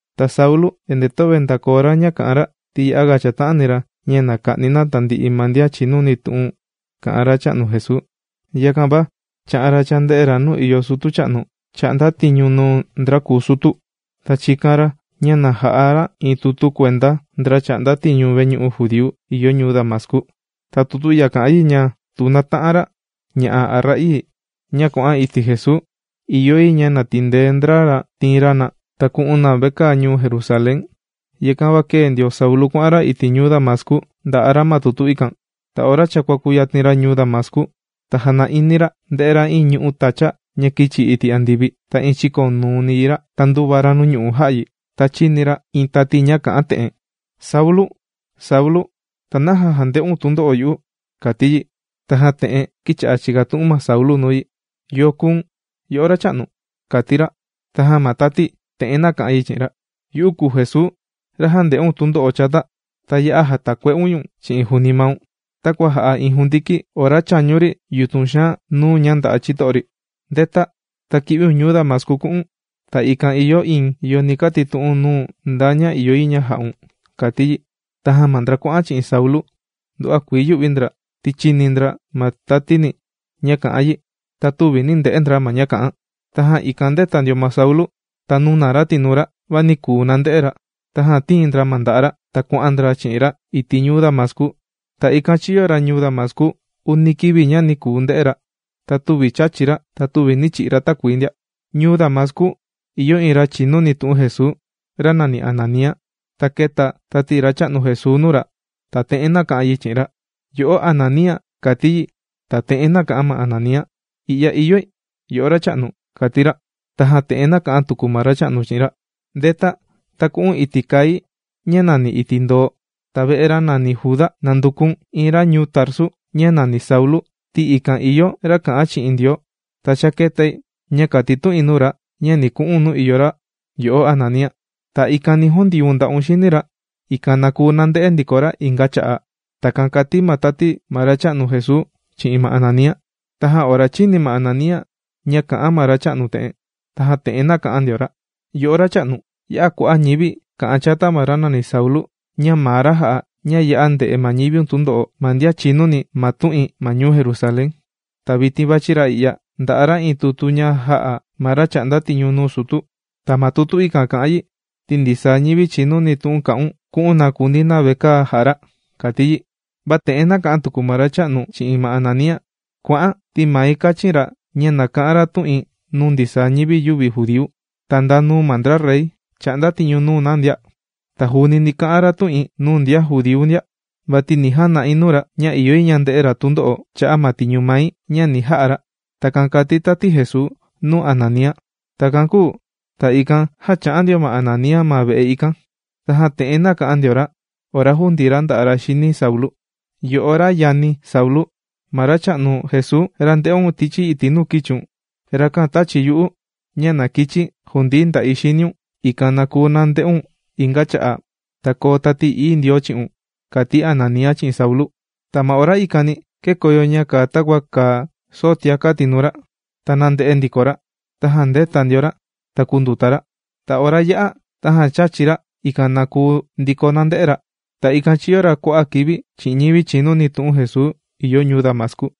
Ta Saulu endee töve ndàkoo ra ña kà'an ra, ti ya'a chàta'ani ra ña na ka'ni na tandi'i ma ndian chìnuni tu'un kà'an Racha'nu Jesuu, yakan va chā'an ra chānde'e ra nuu ìyo sutu cha'nu chà'nda tiñu nuu ndra kùu sutu. Ta chīkan ra ña ja'a ra iin tutu kuenda ndra chà'nda tiñu veñu'u judíu ìyo ñuu Damascu. Ta tutu i'ya kà'an yi ña tu nata'an ra ña'a' a ra'ii ña kuà'an iti' Jesuu, ìyo yi ña na tindee ndra ra tiin ra na ta ku'un na vekaa ñuu Jerusalén. Yakan va kēe ndio Saulu kuà'an ra iti' ñuu Damascu ndà'a ra ma tutu ikan. Va ora cha kuàkuyatin ra ñuu Damascu, ta jana'ini ra ndē'e ra iin ñu'ú tacha ña kīchi iti' andivi. Ta iin chīkonuuni yi ra. Ta ndūva ra nuu ñu'u' jā'a yi, ta chīni ra iin tati ña te'en kà'an: ―Saulu, Saulu, ¿ta naja jànde'un tundo'o yu'u? ―kàti yi. Tajan te'en kīcha'a chìkatu'un ma Saulu nuu yi: ―¿Yo kùu̱n, yo'o Racha'nu? ―kàti ra. Tajan ma tati te'en nāka'an yi chi'in ra: ―Yu'u kùu Jesuu, ra jànde'un tundo'o chata. Ta ya'a jàtakue'un ñu̱n chi'in juuni maun, takua jà'a iin jundiki ora chàñu ri yutun xaan nuu ña ndà'a ma chito'o ri. ¡Ndeta, ta ki'viun ñuu Damascu ku'u̱n! Ta ikan ìyo iin yo ni katitu'un nuu̱n nda ña ìyo yi ña ja'un ―kàti yi. Tajan ma ndra kuà'an chi'in Saulu, nduva'a kuii yū'vi ndra ti chīni ndra ma tatini ña kā'an yi, va tüvi nī nde'e ndra ma ña kā'an. Tajan ikan ndēta ndio ma Saulu, ta nūna ra tinuu ra, va nī kuu nande'e ra. Tajan tīin ndra ma nda'a' ra, ta kuà'an ndra chi'in ra iti' ñuu Damascu. Ta ikan chīyo ra ñuu Damascu uni kivi ña nī kuu nde'e ra ta tüvi chāchi ra ta töve nī chi'i ra takuii ndia. Ñuu Damascu, ìyo iin ra chìnuni tu'un Jesuu ra nàni Ananía. Ta kēta tati Racha'nu Jesuu nuu ra, ta te'en nāka'an yi chi'in ra: ―¡Yo'o Ananía! ―kàti yi. Tajan te'en nāka'an ma Ananía: ―I'ya ìyoi, yo'o Racha'nu ―kàti ra. Tajan te'en nāka'an tuku ma Racha'nu chi'in ra: ―Ndeta ta ku'un iti' kai ña nàni Iti' Ndoo, ta ve'e ra nàni Juda, nanduku̱n iin ra ñuu Tarsu, ña nàni Saulu, ti ikan ìyo ra kà'an chi'in Ndioo. Ta cha kētai ña kàtitu'in nuu ra ña ni ku'u̱n nuu ìyo ra, yo'o Ananía, ta ikan ni jundiun nda'un xini ra, ikan na kuu nande'e ndiko ra inga cha'a'. ―Takan kàti ma tati ma Racha'nu Jesuu chi'in ma Ananía. Tajan ora chīni ma Ananía ña kà'an ma Racha'nu te'en, tajan te'en nāka'an ndio ra: ―Yo'o Racha'nu, ya'a kua'a' ñivi kà'an chata ma ra nàni Saulu, ña maa ra jà'a ña ya'a ndè'e ma ñiviun ma tundo'o ma ndian chìnuni ma tu'in ma ñuu Jerusalén. Ta vitin vàchi ra i'ya ndà'a ra iin tutu ña jā'a ma ra chà'nda tiñu nuu sutu. Ta ma tutu ikan kà'an yi ti ndisaa ñivi chìnuni tu'un kà'un ku'un na kundii na vekaa jà'a ra ―kàti yi. Va te'en nāka'an tuku ma Racha'nu chi'in ma Ananía: ―¡Kua'an!, ti mai kāchin ra ña na ka'an ra tu'in nuu ndisaa ñivi yüvi judíu, ta nda nuu ma ndra rey, chà'nda tiñu nuu na ndia. Ta juuni ni ka'an ra tu'in nuu ndian judíu ndia. Vati ni jana'i nuu ra ña ìyo yi ña nde'e ra tundo'o cha'a' ma tiñu mai ña ni ja'a ra. ―Takan kàti tati Jesuu nuu Ananía. Takan kūu ta ikan jan chā'an ndio ma Ananía ma ve'e ikan. Tajan te'en nāka'an ndio ra ora jūndii ra nda'a' ra xini Saulu: ―Yo'o ra yani̱ Saulu, ma Racha'nu Jesuu, ra ndē'un tichi iti' nuu kīchiun, rakan tāchi yu'u ña na kichi̱ jundii nda'i xiniun, ikan na kuu nande'un inga cha'a' ta koo Tati Ií Ndioo chi'un ―kàti Ananía chi'in Saulu. Ta ma ora ikani kēkoyo ña kàa takua kàa soo tiaka' tinuu ra, ta nànde'e ndiko ra. Tajan ndēta ndio ra, ta kūnduta ra. Ta ora yā'a, tajan chāchi ra, ikan na koo ndiko ñàndee ra. Ta ikan chīyo ra kua'a' kivi chi'in ñivi chìnuni tu'un Jesuu ìyo ñuu Damascu.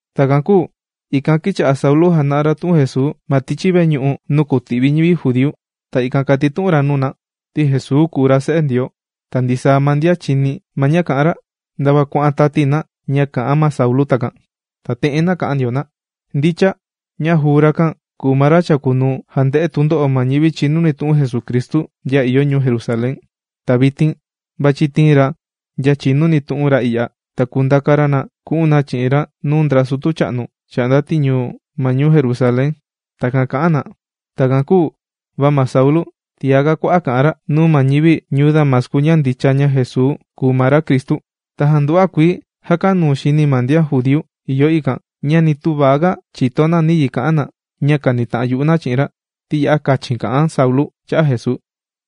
Takan kūu ikan kīcha'a Saulu jàna'a ra tu'un Jesuu ma tichi veñu'u nuu kùti'vi ñivi judíu. Ta ikan kàtitu'un ra nuu na, ti Jesuu kùu ra se'e Ndioo. Ta ndisaa ma ndian chìni ma ña kà'an ra ndava kuà'an tati na ña kà'an ma Saulu takan. Tajan te'en nāka'an ndio na: ―Ndicha, ña juu rakan kùu ma ra chàkunuu jànde'e tundo'o ma ñivi chìnuni tu'un Jesucristu ndian ìyo ñuu Jerusalén. Ta vitin vàchi tiin ra ndian chìnuni tu'un ra i'ya, ta kùndaka ra na ku'un na chi'in ra nuu ndra sutu cha'nu, chà'nda tiñu ma ñuu Jerusalén. ―Takan kà'an na. Takan kūu va ma Saulu, tiaga kua'a' kà'an ra nuu ma ñivi ñuu Damascu ña ndicha ña Jesuu kùu ma ra Cristu. Tajan nduva'a kuii jākanuu xini ma ndian judíu ìyo ikan ña nī tüva ga chìto na nayi ka'an na ña kànita'an yu'u na chi'in ra, ti ya'a kachin kà'an Saulu cha'a' Jesuu.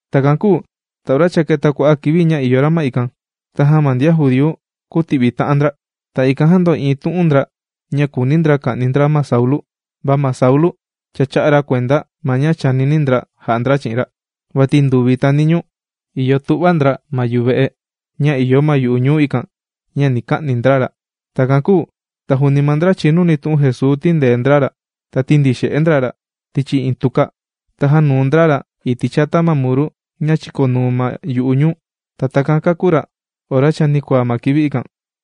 Takan kūu ta ora cha kēta kua'a' kivi ña ìyo ra ma ikan, tajan ma ndra judíu kūti'vi ta'an ndra. Ta ikan jāndo'iin tu'un ndra, ña kùuni ndra ka'ni ndra ma Saulu. Va ma Saulu cha chā'a ra kuenda ma ña chànini ndra ja'a ndra chi'in ra. Vati nduvi ta niñuu ìyo tu'va ndra ma yuve'e ña ìyo ma yu'u ñuu ikan ña ni ka'ni ndra ra. Takan kūu va juuni, ma ndra chìnuni tu'un Jesuu tīndee ndra ra. Ta tīndixe'e ndra ra tichi iin tuka, ta jānuu ndra ra iti' chata ma muru ña chìkonuu ma yu'u ñuu. Ta takan kākú ra ora chanikuaa ma kivi ikan.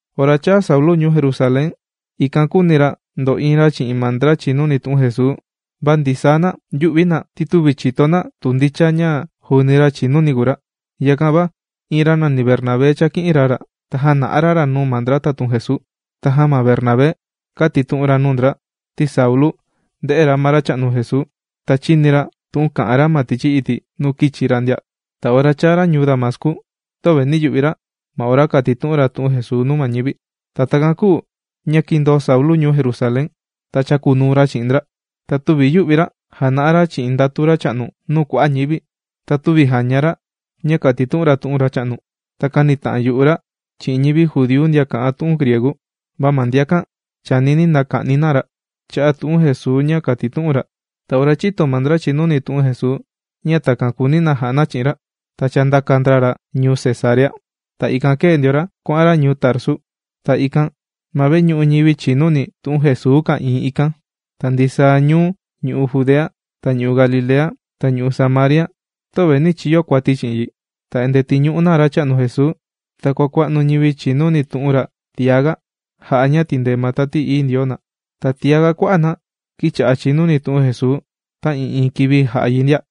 Ora chāa Saulu ñuu Jerusalén, ikan kūuni ra ndo'iin ra chi'in ma ndra chìnuni tu'un Jesuu. Va ndisaa na yū'vi na ti tüvi chìto na tu ndicha ña juuni ra chìnuni kùu ra. Yakan va iin ra nàni Bernabé chāki'in ra ra, ta jāna'a ra ra nuu ma ndra tatun Jesuu. Tajan ma Bernabé kātitu'un ra nuu ndra, ti Saulu ndē'e ra ma Racha'nu Jesuu ta chīni ra tu'un kà'an ra ma tichi iti' nuu kīchi ra ndia. Ta ora chāa ra ñuu Damascu töve nī yu'vi ra ma ora kātitu'un ra tu'un Jesuu nuu ma ñivi. Ta takan kūu ña kīndoo Saulu ñuu Jerusalén, ta chākunuu ra chi'in ndra. Ta tüvi yù'vi ra jàna'a ra chi'in ndatu Racha'nu nuu kua'a' ñivi. Ta tüvi jàña ra ña kàtitu'un ra tu'un ma Racha'nu. Ta kānita'an yu'u ra chi'in ñivi judíu ndian kà'an tu'un griegu. Va ma ndiakan chànini na ka'ni na ra cha'a' tu'un Jesuu ña kàtitu'un ra. Ta ora chīto ma ndra chìnuni tu'un Jesuu, ña takan kùuni na ja'a na chi'in ra, ta chāndaka ndra ra ñuu Cesarea. Ta ikan kēe ndiko ra kuà'an ra ñuu Tarsu. Ta ikan ma veñu'u ñivi chìnuni tu'un Jesuu ka'ìin ikan, ta ndisaa ñuu ñu'u' Judea, ta ñu'u' Galilea, ta ñu'u' Samaria, töva nī chiyo kuati chi'in yi. Ta endee tìñu'u na Racha'nu Jesuu, ta kuàkua'nu ñivi chìnuni tu'un ra tiaga, jà'a ña tìndee ma Tati Ií Ndioo na. Ta tiaga kua'a' na kīcha'a chìnuni tu'un Jesuu ta'ii'iin kivi jà'a yi ndia.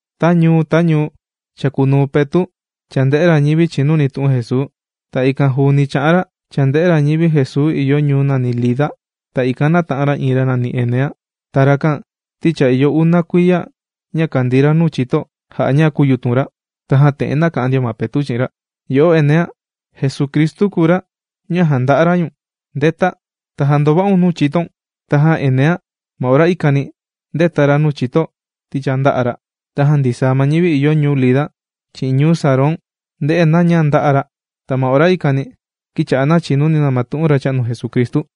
Ta ñuu ta ñuu chàkunuu Petu' chànde'e ra ñivi chìnuni tu'un Jesuu. Ta ikan juuni chà'an ra chànde'e ra ñivi Jesuu ìyo ñuu nàni Lida. Ta ikan nāta'an ra iin ra nàni Enea. Ta rakan ti cha ìyo una kuiya ña kàndii ra nuu chito jà'a ña kūyutun ra. Tajan te'en nāka'an ndio ma Petu' chi'in ra: ―Yo'o Enea, Jesucristu kùu ra ña jànda'a ra ñu̱n. ¡Ndeta, ta jandova'un nuu chitoun! Tajan Enea ma ora ikani, ndēta ra ma nuu chito ti cha ndā'a ra. Tajan ndisaa ma ñivi ìyo ñuu Lida chi'in ñuu Sarón ndē'e na ña ndā'a ra. Ta ma ora ikani, kīcha'a na chìnuni na tu'un Racha'nu Jesucristu.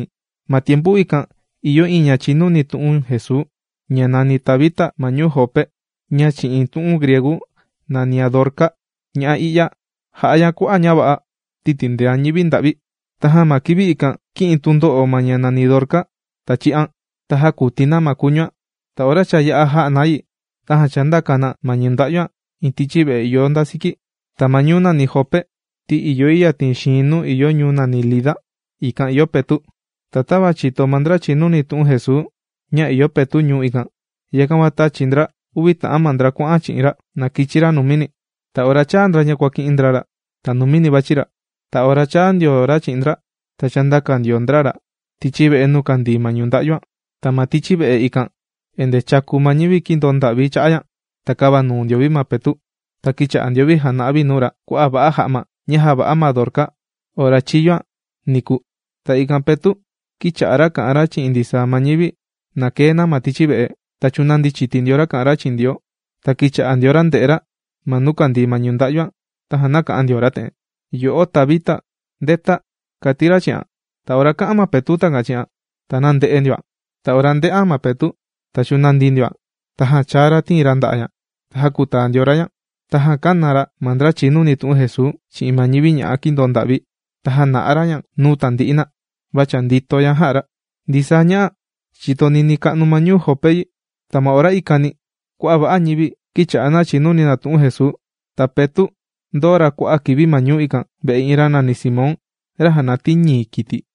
Ma tiempu ikan ìyo iin ña chìnuni tu'un Jesuu ña nàni Tabita ma ñuu Jope ña chi'in tu'un griegu nànian Dorca. Ña'a i'ya jà'a ña kua'a' ña va'a, ti tìndean ñivi nda'vi. Tajan ma kivi ikan, kī'in tundo'o ma ña nàni Dorca. Tajan chī'an. Ta jākuti na ma kuñuan. Ta ora cha yā'a jà'a na yi, tajan chāndaka na ma ñunda'yuan iin tichi ve'e ìyo nda siki. Ta ma ñuu nàni Jope ti ìyo yi yatin xiin nuu ìyo ñuu nàni Lida, ikan ìyo Petu'. Ta tava chìto ma ndra chìnuni tu'un Jesuu ña ìyo Petu' ñuu ikan, yakan va tāchi ndra uvi ta'an ma ndra kuàka'an chi'in ra na kichi ra numini. Ta ora chāa ndra ña kuàki'in ndra ra, ta numini vàchi ra. Ta ora chāa ndio ra chi'in ndra, ta chāndaka ndio ndra ra tichi ve'e nuu kàndii ma ñunda'yu. Ta ma tichi ve'e ikan, endee chàku ma ñivi kīndoo nda'vi cha'a' ña. Ta kāva nuu ndio vi ma Petu' ta kīcha'a ndio vi jāna'a vi nuu ra kua'a' va'a ja'ma ña jāva'a ma Dorca ora chīyo ña niku. Ta ikan Petu' kīcha'a ra kà'an ra chi'in ndisaa ma ñivi na kee na ma tichi ve'e. Ta chūnandi chiti ndio ra kà'an ra chi'in Ndioo, ta kīcha'a ndio ra ndè'e ra ma nuu kàndii ma ñunda'yuan, tajan nāka'an ndio ra te'en: ―¡Yo'o Tabita! ¡Ndeta! ―kàti ra chi'an. Ta ora kā'an ma Petu' takan chi'an, ta nānde'e ndioan. Ta ora ndē'an ma Petu', ta chūnandi ndioan. Tajan chāa ra tìin ra nda'a' ña. Ta jākutaa ndio ra ña. Tajan kāna ra ma ndra chìnuni tu'un Jesuu chi'in ma ñivi ña'a kīndoo nda'vi. Ta jāna'a ra ña nuu tandi'i na. Va cha ndīto ña jà'a ra. Ndisaa ña'a, chīto ninii ka'nu ma ñuu Jope yi. Ta ma ora ikani kua'a' va'a ñivi, kīcha'a na chìnuni na tu'un Jesuu. Ta Petu', ndōo ra kua'a' kivi ma ñuu ikan ve'e iin ra nàni Simón, ra jànatii ñii kiti.